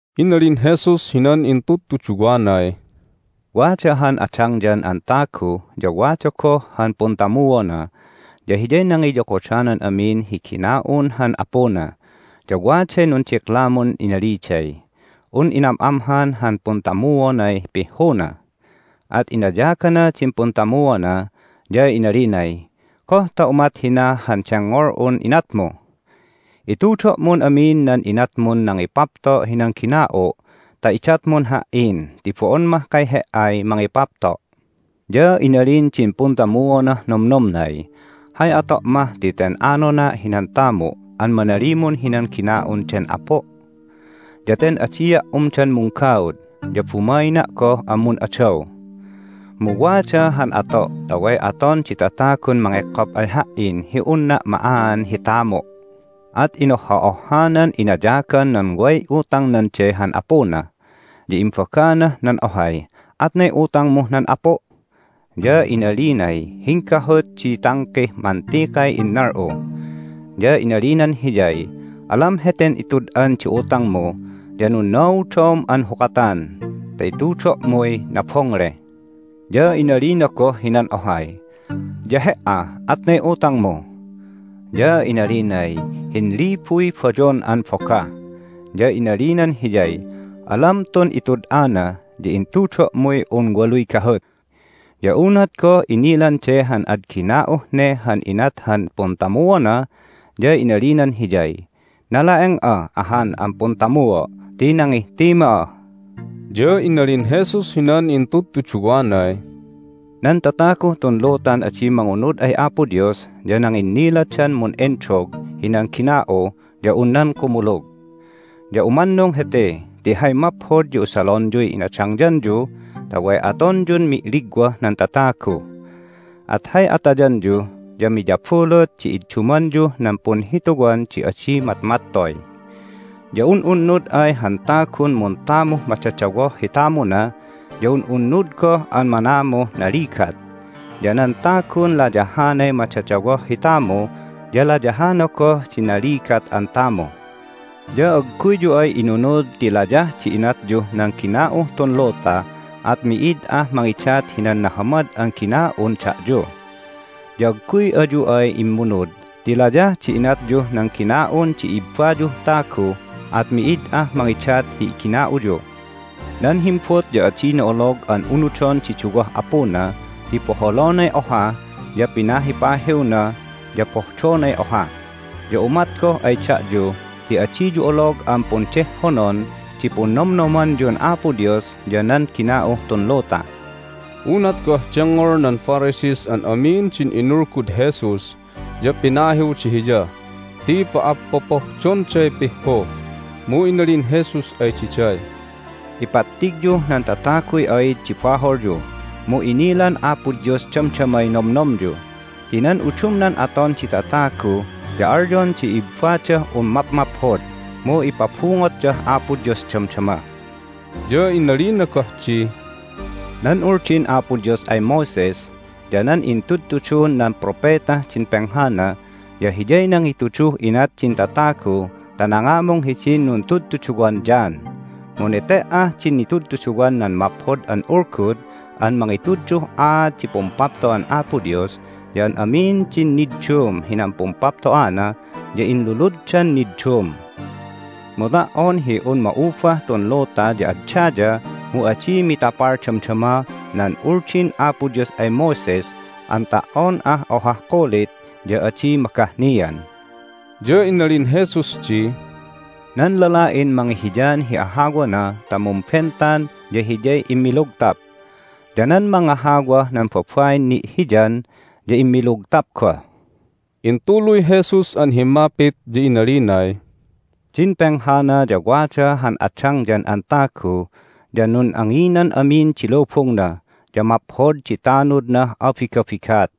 Inalin Jesus hinan intudtuduwanay, "Wada han adangyan an tagu, ya wada goh han puntamuona, ya hiyay nangiyokodanan amin hi gina'un han apuna. Ya waday nundiklamun inaliday un inam'amhan han puntamuonay pihhuna. At inayagana din puntamuona, ya inalinay, Goh ta umat hina han dengngol'un inatmu? Itudo'mun amin nan inatmun nangipapto' hinan gina'u' ta idatmun ha"in ti bo'on mahkay he"ay mangipapto'! Ya inalin din puntamuonah nomnomnay, Hay ato' mah ti ten anona' hinan tamu' an manalimun hinan gina'un den apu'? Ya ten adia' umdan munggaud, ya bumaina' goh an mun'adaw. Mu wada han ato' ta way aton di tatagun mangekkop ay ha"in hi unna' ma'aan hi tamu'! At inohha'ohhanan inayagan nan way utangnan de han apuna, ya imbaganah nan ohay, Atnay utangmuh nan apu'? Ya inalinay, Hinggahut di tangkih mantikay innal'u. Ya inalinan hiyay, Alam heten itud'an di utangmu, ya nunnaudom an hukatan ta itudo'muy nabongle. Ya inalina goh hinan ohay, Ya he"a, atnay utangmu? Ya inalinay, Hinlibuy bayon an bogah. Ya inalinan hiyay, Alam tun itud'ana, ya intudo'muy un waluy gahut. Ya unat goh inilan de han ad gina'uh ne han inat han puntamuona ya inalinan hiyay, Nala'eng'a ahan an puntamuo' ti nangihtima!" Ya inalin Jesus hinan intudtuduwanay, "Nan tataguh tun lutan adi mangunud ay Apo Dios ya nanginniladan mun'endog hinan gina'u ya un nan kumulug. Ya umannung hete ti hay maphod ya usalonyuy inadangyanyu ta way atonyun mi'ligwah nan tatagu, at hay atayanyu ya miyabulut di iddumanyuh nan punhituwan di adi matmattoy. Ya un'unnud ay han tagun muntamuh madadawoh hi tamuna ya un'unnud goh an manamuh naligat, ya nan tagun layahanay madadawoh hi tamu ya layahana goh di naligat an tamu. Ya agguyyu ay inunud ti layah di inatyuh nan gina'uh tun luta at mi'id ah mangidat hinan nahamad an gina'un da'yu. Ya agguy ayu ay immunud ti layah di inatyuh nan gina'un di ibbayuh tagu at mi'id ah mangidat hi igina'uyu. Nan himbut ya adina olog an unudon di duwah apuna ti boholonay oha ya pinahipahiwna, ya pohdonay oha. Ya umat goh ay da'yu ti adiyu olog an pundehhonon di punnomnomanyun Apo Dios ya nan gina'uh tun luta." Unat goh dengngol nan Pharisees an amin din inulgud Jesus ya pinahiwda Hiya ti pa'appopohdonday pihhu. Mu inalin Jesus ay diday, "Ipattigyuh nan tataguy aid di baholyu, mu inilan Apo Dios damdamay nomnomyu. Ti nan udumnan aton di tatagu ya alyon di ibbadah un mapmaphod, mu ipabungotdah Apo Dios damdama." Ya inalina goh di, "Nan Uldin Apo Dios ay Moses ya nan intudtudun nan propetah din penghana ya hiyay nangituduh inat din tatagu ta nangamung hidin nuntudtuduwan John. Mu nete"ah din nitudtuduwan nan Maphod an Ulgud an mangituduh aat di Pumpapto'an Apo Dios ya an amin din niddum hinan pumpapto'ana ya inluluddan niddum. Mu ta"on hi un ma'ubah tun luta ya ad daya mu adi mitapal damdama nan Uldin Apo Dios ay Moses an ta"on ah ohah kulit ya adi magahnian." Ya inalin Jesus di, "Nan lala'in mangihiyan hi ahawana ta mumbentan ya hiyay immilugtap, ya nan mangahawah nan babain ni'hiyan ya immilugtap goh." Intuluy Jesus an himmapit, ya inalinay, "Din penghana ya wada han adangyan an tagu, ya nun'anginan amin di lubungna, ya maphod di tanudnah abigabigat.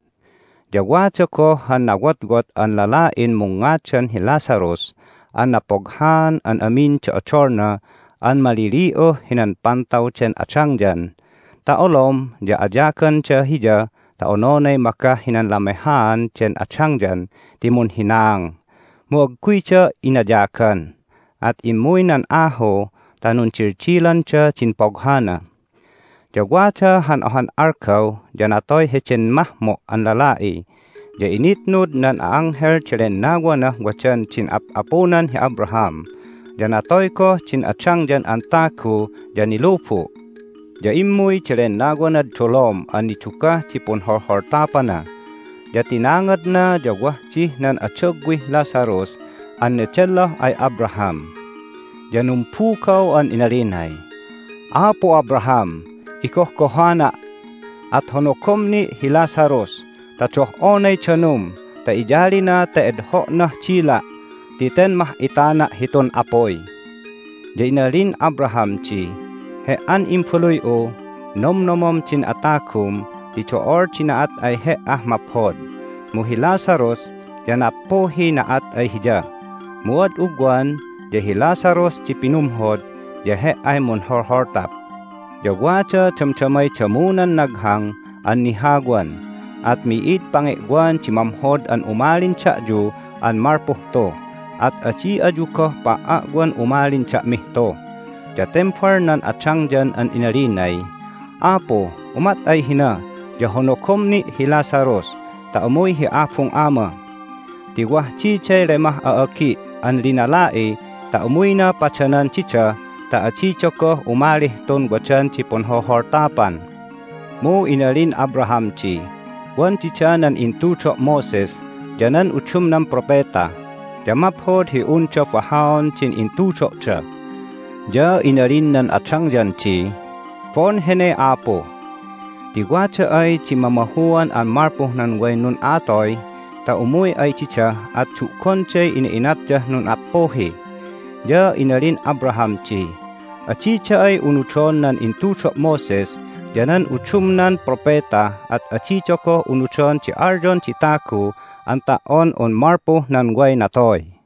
Ya wada goh han nawotwot an lala'in mungngadan hi Lazarus an napoghaan an amin di odolna an malili'uh hinan pantaw den adangyan ta olom ya ayaganda hiya ta ononay magah hinan lamehaan den adangyan ti munhinaang, mu agguyda inayagan. At immuy nan ahu ta nundildilanda din poghana. Ya wada han ohan algaw ya natoy heden mahmo' an lala'i, ya initnud nan a'anghel di lennawanah wadan din ap'apunan hi Abraham. Ya natoy goh din adangyan an tagu, ya nilubu', ya immuy di lennawanad dolom an nidugah di punholholtapana. Ya tinangadna, ya wah dih nan adagwih Lazarus an nedelloh ay Abraham. Ya numbugaw an inalinay, Apu Abraham! Igohgohana'! At honogom ni' hi Lazarus ta doh'onay danum ta iyalina ta edho'nah dila' ti ten mah'itana' hitun apuy! Ya inalin Abraham di, He"an imbaluy'u, nomnomom din atagum ti do'ol di na'at ay he"ah maphod, mu hi Lazarus ya nappuhiy na'at ay hiya. Mu ad ugwan ya hi Lazarus di pinumhod, ya he"ay munholholtap. Ya wada damdamay damunan naghang an nihawan, at mi'id pange'wan di mamhod an umalin da'yu an malpuh tu, at adi ayu goh pa"a'wan umalin da'mih tu. Ya tembal nan adangyan an inalinay, Apu, umat ay hina ya honogom ni' hi Lazarus ta umuy hi abung ama! Ti wah diday lemah a'agi' an linala'i ta umuyna padanan dida ta adida goh umalih tun wadan di punholholtapan! Mu inalin Abraham di, Wan dida nan intudo' Moses ya nan udumnan propeta, ya maphod hi unda bahaon din intudo'da! Ya inalinah nan adangyan di, Bo'on hene, Apu! Ti wada ay di mamahuan an malpuh nan way nun'a'atoy ta umuy ay dida at du'gonday ina'inatdah nun'appuhi! Ya inalin Abraham di, Adida ay unudon nan intudo' Moses ya nan udumnan propeta at adida goh unudon di alyon di tagu an ta"on un malpuh nan way natoy."